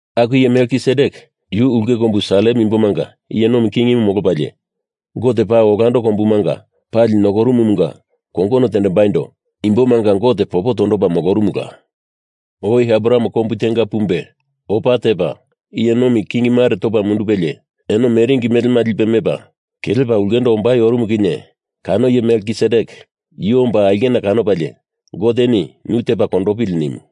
Aku iye Melkisedek yu ulke kombu Salem imbomanga iye nomi kingimu molopalie, Gote Paa Olando Kombumanga Pali Nokorumumunga kongono tendembaindo imbomanga Gote popo tondopa molorumula. Oi Abraham kombu tenga pumbe opa tepa iye nomi king mare topa mundupelie eno meringi melema lipe mepa kelepa ulkendo ombai orumu kinye kano iye Melkisedek yu omba aulkena kanopalie Goteni nu tepa kondopili nimu.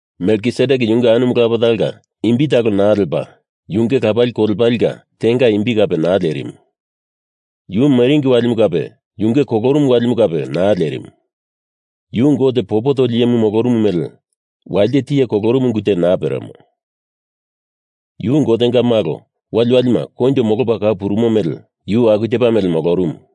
Melkisedek yunge anumu lapa talonga imbi talo naa lepa, yunge lapali kolepalenga tenga imbi kape naa lerimu. Yu meringi walimu kape, yunge kolorumu walimu kape naa lerimu. Yu Gote popo toli iyemu molorumu mele walite tiye kolorumu ungu te naa peremo. Yu Gotenga Malo waliwalima koinjo molopa kau purumo mele yu aku tepa mele molorumu.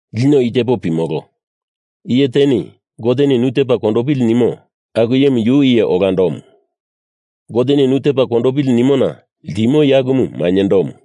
Lino i tepo pimolo. Iye teni Goteni nu tepa kondopili nimo aku iyemu yu iye olandomu, Goteni nu tepa kondopili nimona ltimo iye akumu mainyendomu.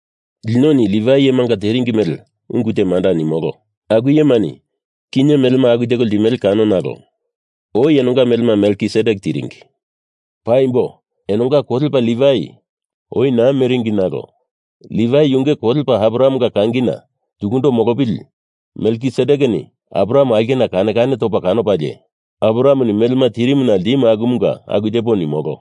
Linoni Livai iyemani teringi mele ungu te manda nimolo. Aku iyemani kinye melema aku teko ltimele kano nalo oi enonga melema Melkisedek tiringi. Paimbo enonga kolepa Livai oi naa meringi nalo Livai yunge kolepa Abrahamenga kangina tukundo molopili Melkisedekeni Abraham aulkena kane kane topa kanopalie Abrahameni melema tirimuna ltimu akumunga aku tepo nimolo.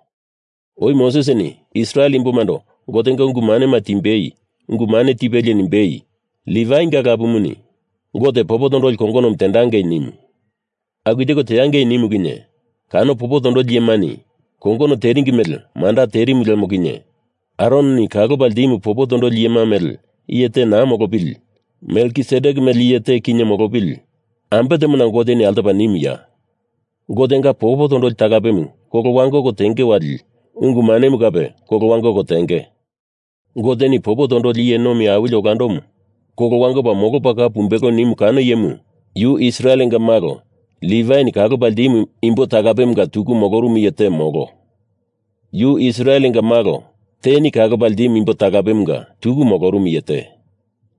Oi Mosesini Israel imbomando Gotenga ungu manema timbei ungu mane te tipelie nimbei, Livainga lapumuni Gote popo tondoli kongonomu teangei nimu. Aku teko teangei nimu kinye kano popo tondoli iyemani kongono teringi mele manda terimu lemo kinye Aroni kalopa ltimu popo tondoli iyema mele iye te naa molopili, Melkisedek mele iye te kinye molopili ambe temona Goteni altopa nimuya? Gotenga popo tondoli talapemu kolo wangoko tenge wali ungu manemu kape kolo wangoko tenge. Goteni popo tondoli iye nomi awili olandomu kolo wangopa molopa kau pumbelo nimu kano iyemu yu Israelenga malo Livaini kalopa ltimu imbo talapemunga tuku molorumu iye te, molo. Yu Israelenga malo teni kalopa ltimu imbo talapemunga tuku molorumu iye te.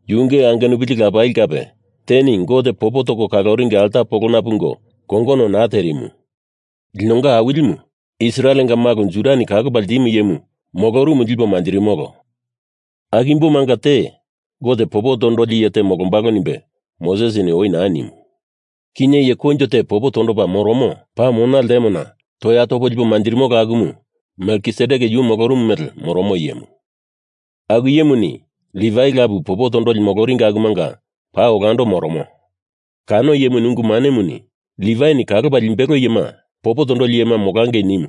Yunge angenupili lapali kape teni Gote popo toko kaloringi alta polona pungo kongono naa terimu. Linonga Awilimu Israelenga malo Judani kalopa ltimu iyemu molorumu lipo manjirimolo. Aku imbomanga te Gote popo tondoli iye te molombalo nimbe Mosesini oi naa nimu. Kinye iye koinjo te popo tondopa moromo paa mona ltemona toya topo lipo manjirimolo akumu Melkisedek yu molorumu mele moromo iyemu. Aku iyemuni Livai lapu popo tondoli moloringi akumanga paa olando moromo. Kano iyemu ungu manemuni Livaini kalopa limbelo iyema popo tondoli iyema molangei nimu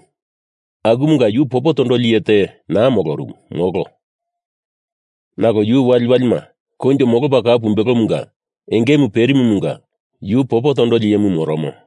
akumanga yu popo tondoli iye te naa molorumu, molo. Nalo yu waliwalima koinjo molopa kau pumbelomunga engemu perimumunga yu popo tondoli iyemu moromo.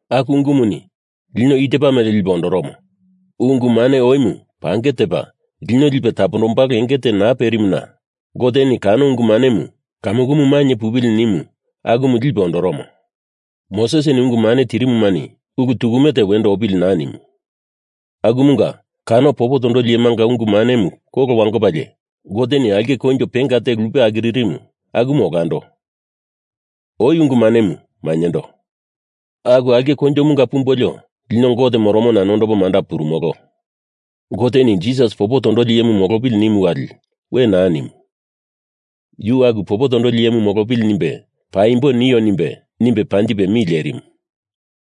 Aku ungumuni lino i tepa mele lipe ondoromo. Ungu mane oimu pange tepa lino lipe tapondombalo enge te naa perimuna Goteni kano ungu manemu kamukumu mainye pupili nimu, akumu lipe ondoromo. Mosesini ungu mane tirimumani ulu tukume te wendo opili naa nimu. Akumunga kano popo tondoli iyemanga ungu manemu kolo wangopalie Goteni aulke koinjo penga te lupe akiririmu akumu olando, oi ungu manemu mainyendo. Aku aulke koinjomunga pumbolio lino Gote moromona nondopo manda purumolo. Goteni Jisas popo tondoli iyemu molopili nimu wali we naa nimu. Yu aku popo tondoli iyemu molopili nimbe paimbo nio nimbe, nimbe panjipe mi lerimu.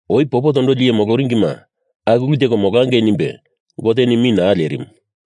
Oi popo tondoli iye moloringima aku ulu teko molangei nimbe Goteni mi naa lerimu,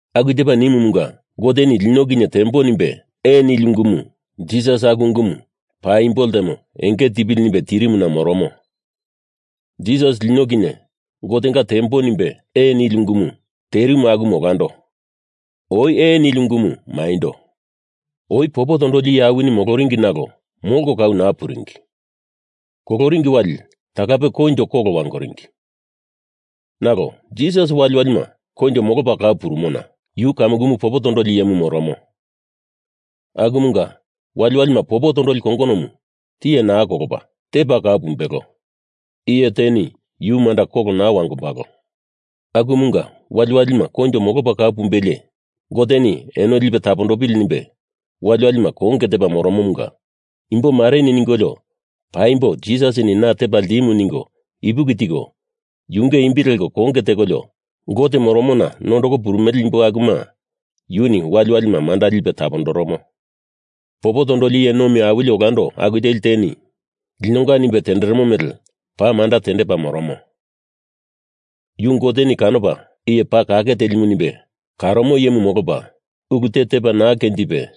Aku tepa nimumunga Goteni lino kinye tembo nimbe ee nili ungumu Jisas aku ungumu paimbo ltemo enge tipili nimbe tirimuna moromo. Jisas lino kinye Gotenga tembo nimbe ee nili ungumu terimu aku olando, oi ee nili ungumu maindo. Oi popo tondoli iye awinima moloringi nalo molko kau naa puringi. Koloringi wali talape koinjo kolo wangoringi, nalo Jisas waliwalima koinjo molopa kau purumona yu kamukumu popo tondoli iyemu moromo. Akumunga waliwalima popo tondoli kongonomu tiye naa kolopa, tepa kau pumbelo, iye teni yu manda kolo naa wangombalo. Akumunga waliwalima koinjo molopa kau pumbelie Goteni eno lipe tapondopili nimbe waliwalima konge tepa moromomunga imbo mareni ningolio paimbo Jisas na tepa ltimu ningo ipuki tiko yunge imbi leko konge tekolio Gote moromona nondoko purumele imbo akuma yuni waliwalima manda lipe tapondoromo. Popo tondoli iye nomi awili olando aku teli teni linonga nimbe tenderemo mele paa manda tendepa moromo. Yu Goteni kanopa iye paa kake teli nimbe karomo iyemu molopa, ulu te tepa naa kenjipe,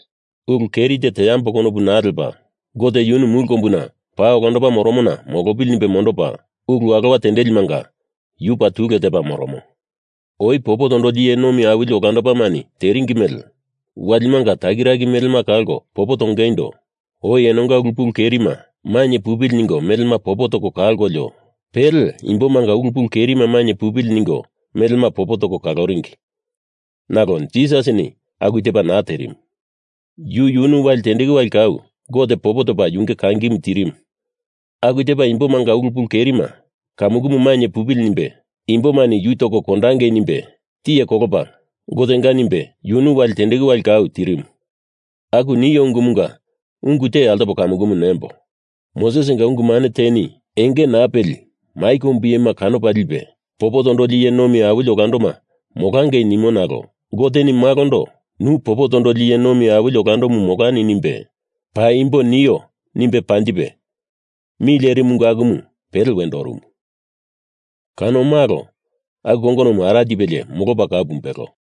ulu keri te teambo konopu naa lepa Gote yunu mulu kombuna paa olando moromona molopili nimbe mondopa ulu alowa tendelimanga yu paa tule tepa moromo. Oi popo tondoli iye nomi awili olandomani teringi mele walimanga takiraki melema kalko popo tongeindo oi enonga ulu pulu kerima mainye pupili ningo melema popo toko kalkolio, pele imbomanga ulu pulu kerima mainye pupili ningo melema popo toko kalondoringi, nalo Jisasini aku tepa naa terimu. Yu yunu wali tendeku wali kau Gote popo topa yunge kangimu tirimu aku tepa imbomanga ulu pulu kerima kamukumu mainye pupili nimbe imbomani yu toko kondangei nimbe tiye kolopa Gotenga nimbe yunu wali tendeku wali kau tirimu. Aku nio ungumunga ungu te altopo kamukumu nembo, Mosesinga ungu mane teni enge naa peli mai kombu iyema kanopa lipe popo tondoli iye nomi awili olandoma molangei nimo nalo Goteni Malondo nu popo tondoli iye nomi awili olandomu molani nimbe paimbo nio nimbe panjipe mi lerimu ungu akumu pele wendo orumu. Kano Malo aku kongonomu ara tipelie molopa kau pumbelo.